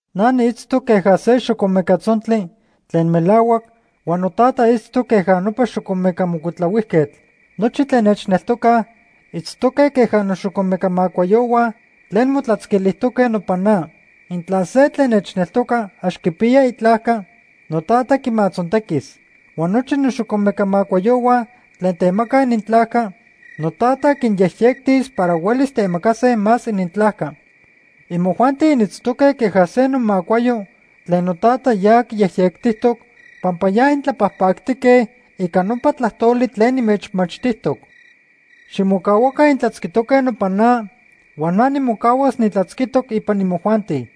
“Na niitztoc queja se xocomeca tzontli tlen melahuac huan noTata itztoc queja nopa xocomeca mocuitlahuijquetl. Nochi tlen nechneltocaj itztoque queja noxocomeca macuayohua tlen motlatzquilijtoque nopan na. Intla se tlen nechneltoca ax quipiya itlajca, noTata quimatzontequis. Huan nochi noxocomeca macuayohua tlen temacaj inintlajca, noTata quinyejyectis para huelis temacase más inintlajca. Imojuanti initztoque queja se nomacuayo tlen noTata ya quiyejyectijtoc, pampa ya intlapajpactique ica nopa tlajtoli tlen nimechmachtijtoc. Ximocahuaca intlatzquitoque nopan na huan na nimocahuas nitlatzquitoc ipan imojuanti.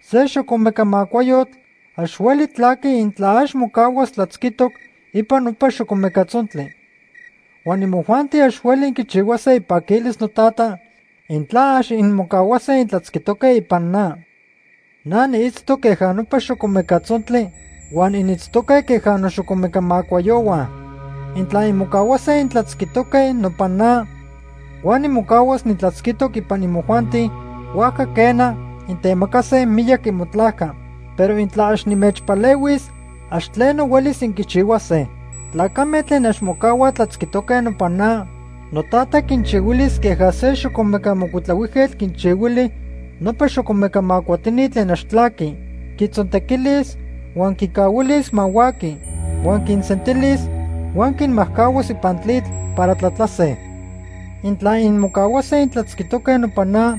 Se xocomeca macuayotl ax hueli tlaqui intla ax mocahuas tlatzquijtoc ipan nopa xocomeca tzontli. Huan imojuanti ax hueli inquichihuase ipaquilis noTata intla ax inmocahuase intlatzquijtoque ipan na. “Na niitztoc queja nopa xocomeca tzontli huan initztoque queja noxocomeca macuayohua. Intla inmocahuase intlatzquijtoque nopan na huan nimocahuas nitlatzquitoc ipan imojuanti, huajca quena, intemacase miyac imotlajca. Pero intla ax nimechpalehuis, ax tleno huelis inquichihuase. Tlacame tlen ax mocahuaj tlatzquijtoque nopan na, noTata quinchihuilis queja se xocomeca mocuitlahuijquetl quinchihuili nopa xocomeca macuatini tlen ax tlaqui. Quitzontequilis huan quicahuilis ma huaqui. Huan quinsentilis huan quinmajcahuas ipan tlitl para tlatlase. “Intla inmocahuase intlatzquijtoque nopan na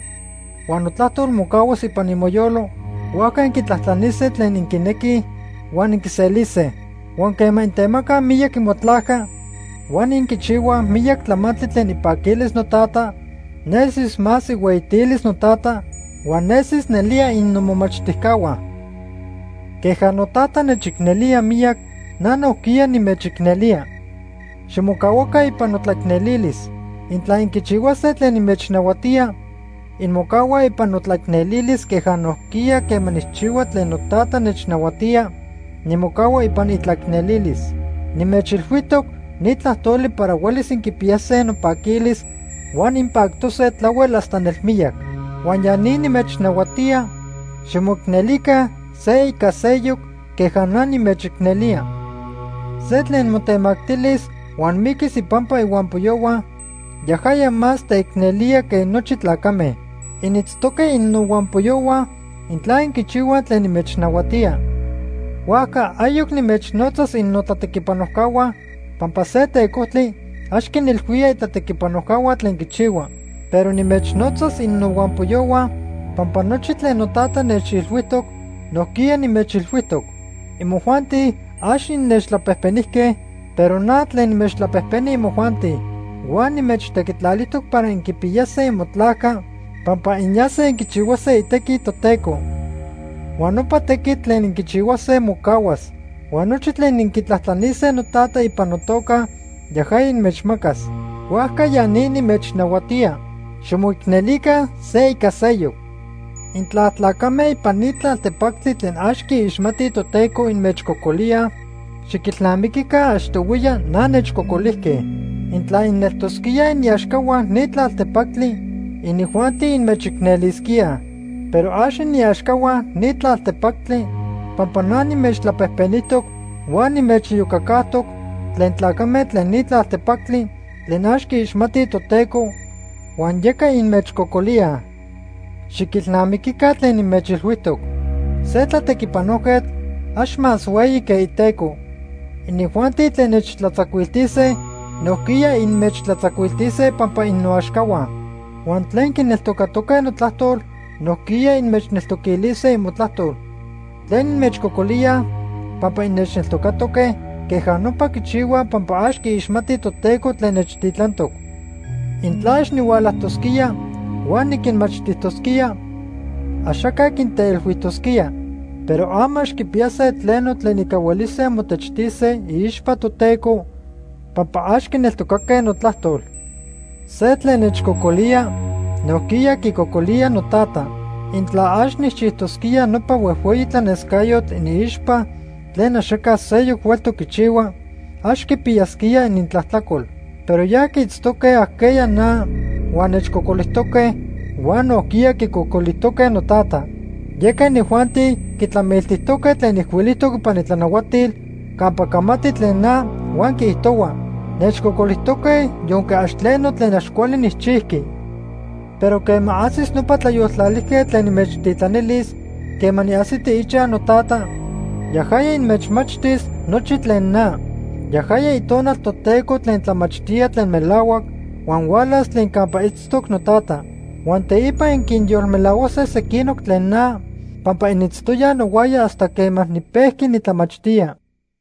huan notlajtol mocahuas ipan imoyolo, huajca inquitlajtlanise tlen inquinequij huan inquiselise. Huan quema intemacaj miyac imotlajca huan inquichihuaj miyac tlamantli tlen ipaquilis noTata, nesis más ihueyitilis noTata huan nesis nelía innomomachtijcahua. Queja noTata nechicnelía miyac, na nojquiya nimechicnelía. Ximocahuaca ipan notlateicnelilis. Intla inquichihuase tlen nimechnahuatía, inmocahuaj ipan notlaicnelilis queja nojquiya quema nijchihua tlen noTata nechnahuatía, nimocahua ipan itlaicnelilis. “Nimechilhuijtoc ni tlajtoli para huelis inquipiyase nopaquilis huan inpactose tlahuel hasta nelmiyac. Huan ya ni nimechnahuatía, ximoicnelica se ica seyoc queja na nimechicnelía. Se tlen motemactilis huan miquis ipampa ihuampoyohua, yajaya más teicnelía que nochi tlacame. Initztoque innohuampoyohua intla inquichihuaj tlen nimechnahuatía. Huajca ayoc nimechnotzas innotlatequipanojcahua, pampa se tecojtli ax quinilhuía itlatequipanojcahua tlen quichihua. Pero nimechnotzas innohuampoyohua, pampa nochi tlen noTata nechilhuijtoc nojquiya nimechilhuijtoc. Imojuanti ax innechtlapejpenijque, pero na tlen nimechtlapejpeni imojuanti. Huan nimechtequitlalijtoc para inquipiyase imotlajca pampa inyase inquichihuase itequi Toteco. Huan nopa tequitl tlen inquichihuase mocahuas. Huan nochi tlen inquitlajtlanise noTata ipan notoca yajaya inmechmacas. Huajca ya ni nimechnahuatía: ximoicnelica se ica seyoc. “Intla tlacame ipan ni tlaltepactli tlen ax quiixmatij Toteco inmechcocolíaj, xiquilnamiquica achtohuiya na nechcocolijque. Intla ineltosquíaj iniaxcahua ni tlaltepactli, inijuanti inmechicnelisquíaj. Pero ax iniaxcahua ni tlaltepactli pampa na nimechtlapejpenijtoc huan nimechiyocacajtoc tlen tlacame tlen ni tlaltepactli tlen ax quiixmatij Toteco, huan yeca inmechcocolíaj. Xiquilnamiquica tlen nimechilhuijtoc. Se tlatequipanojquetl ax más hueyi que iteco. Inijuanti tlen nechtlatzacuiltise, nojquiya inmechtlatzacuiltise pampa innoaxcahua. Huan tlen quineltocatoque notlajtol nojquiya inmechneltoquilise imotlajtol. Tlen inmechcocolíaj pampa innechneltocatoque, queja nopa quichihuaj pampa ax quiixmatij Toteco tlen nechtitlantoc. “Intla ax nihualajtosquía huan niquinmachtijtosquía, axaca quinteilhuijtosquía. Pero ama ax quipiyase tleno tlen ica huelise motechtise iixpa Toteco pampa ax quineltocaque notlajtol. Se tlen nechcocolía, nojquiya quicocolía noTata. Intla ax nijchijtosquía nopa huejhueyi tlanescayotl iniixpa tlen axaca seyoc hueltoc quichihua, ax quipiyasquía inintlajtlacol. Pero ya quiitztoque ajqueya na huan nechcocolijtoque huan nojquiya quicocolijtoque noTata. Yeca inijuanti quitlamiltijtoque tlen ijcuilijtoc ipan itlanahuatil campa camati tlen na huan quiijtohua: ‘Nechcocolijtoque yonque ax tleno tlen ax cuali nijchijqui.’ “Pero quema ajsis nopa Tlayoltlalijquetl tlen nimechtitlanilis quema niajsiti ichaj noTata, yajaya inmechmachtis nochi tlen na. Yajaya Itonal Toteco tlen tlamachtía tlen melahuac huan hualas tlen campa itztoc noTata. Huan teipa inquinyolmelahuase sequinoc tlen na pampa initztoyaj nohuaya hasta quema nipejqui nitlamachtía.